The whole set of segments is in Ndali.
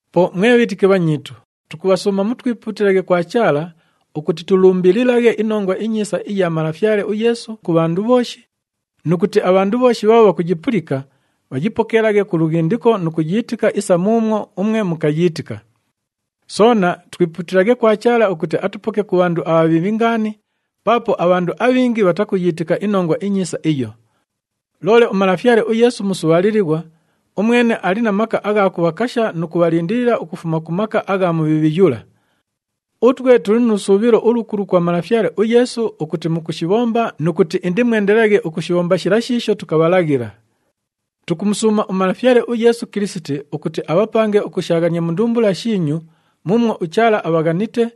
Po mwe bhiitiki bhanyiitu, tukubhasuuma mutwipuutilaghe kwa Chaala ukuti tulumbililaghe iNongwa iNyiisa iya Malafyale uYeesu ku bhandu bhooshi nu kuti abhandu bhooshi bhaabho bhakuyipulika, bhayipokeelaghe ku lughindiko nu kuyiitika isa muumwo umwe mukayiitika. Soona twipuutilaghe kwa Chaala ukuti atupoke ku bhandu abhabhiibhi ngaani paapo abhandu abhingi bhatakuyiitika iNongwa iNyiisa iyo. Loole uMalafyale uYeesu musubhaalilighwa, umwene ali na maka agha kubhakasha nu kubhalindilila ukufuma ku maka agha Mubhiibhi yula. Utwe tuli nu lusuubhilo ulukulu kwa Malafyale uYeesu ukuti mukushibhomba nu kuti indimwendelelaghe ukushibhomba shila shiisho tukabhalaghila. Tukumusuuma uMalafyale uYeesu Kilisiti ukuti abhapange ukushaaghania mu ndumbula shiinyu muumwo uChaala abhaghanite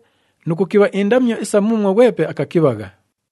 nu kukibha indamyo isa muumwo ghwepe akakibhagha.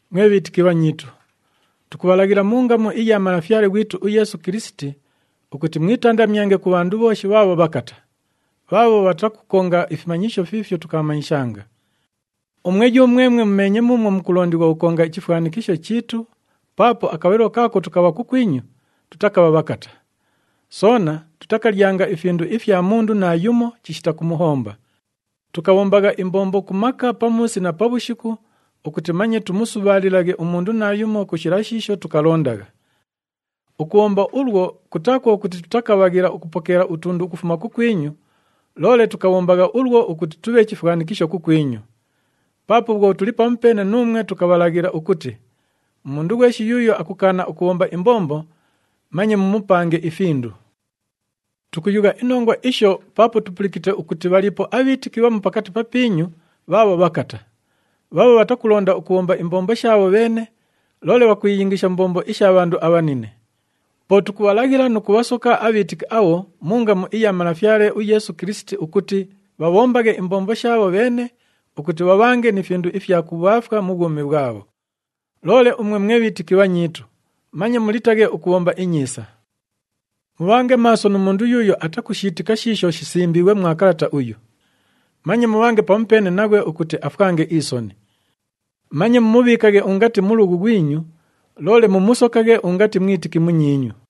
Mwe bhiitiki bhanyiitu, tukubhalaghila mu ngamu iya Malafyale ghwitu uYeesu Kilisiti ukuti mwitandamyange ku bhandu bhooshi bhaabho bhakata, bhaabho bhatakukonga ifimanyisho fiifyo tukabhamanyishanga. Umwe yumwemwe mumeenye muumwo mukulondighwa ukukonga ichifwanikisho chiitu paapo akabhalilo kaako tukabha kukwinyu, tutakabha bhakata. Soona tutakalyanga ifindu ifya mundu naayumo chishita kumuhomba. Tukabhombagha imbombo ku maka pamuusi na pabhushiku ukuti manye tumusubhaalilaghe umundu naayumo ku shila shiisho tukalondagha. Ukubhomba ulwo, kutaa kwo kuti tutakabhaghila ukupokeela utundu ukufuma kukwinyu, loole tukabhombagha ulwo ukuti tubhe chifwanikisho kukwinyu. Paapo bhwo tuli pamupeene nuumwe, tukabhalaghila ukuti, “Umundu ghweshi yuuyo akukaana ukubhomba imbombo, manye mumupange ifindu.” Tukuyugha inongwa isho paapo tupulikite ukuti bhaliipo abhiitiki bhamu pakati papiinyu bhaabho bhakata, bhaabho bhatakulonda ukubhomba imbombo shaabho bheene, loole bhakwiyingisha mu mbombo isha bhandu abhanine. Po tukubhalaghila nu kubhasoka abhiitiki abho mu ngamu iya Malafyale uYeesu Kilisiti ukuti bhabhombaghe imbombo shaabho bheene ukuti bhabhange ni findu ifya kubhaafwa mu bhwumi bhwabho. Loole umwe mwe bhiitiki bhanyiitu, manye mulitaghe ukubhomba inyiisa. Mubhange maaso nu mundu yuuyo atakushiitika shiisho shisimbiighwe mwa kalata uyu. Manye mubhange pamupeene naghwe ukuti afwange isoni. Manye mumubhiikaghe ungati mulughu ghwinyu, loole mumusokaghe ungati mwitiki munyiinyu.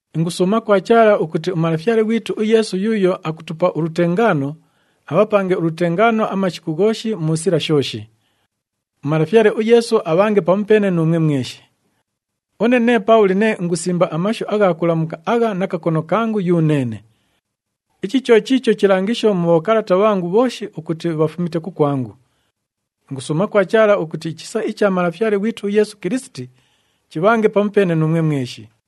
Ingusuuma kwa Chaala ukuti uMalafyale ghwitu uYeesu yuuyo akutupa ulutengaano, abhapange ulutengaano amashiku ghooshi mu sila shooshi. UMalafyale uYeesu abhange pamupeene nuumwe mweshi. Une nee Paabhuli nee ingusimba amashu agha kulamuka agha na kakono kangu yuneene. Ichi cho chiicho chilangisho mu bhokalata bhangu bhooshi ukuti bhafumite kukwangu. Ingusuuma kwa Chaala ukuti ichisa icha Malafyale ghwitu uYeesu Kilisiti chibhange pamupeene nuumwe mweshi.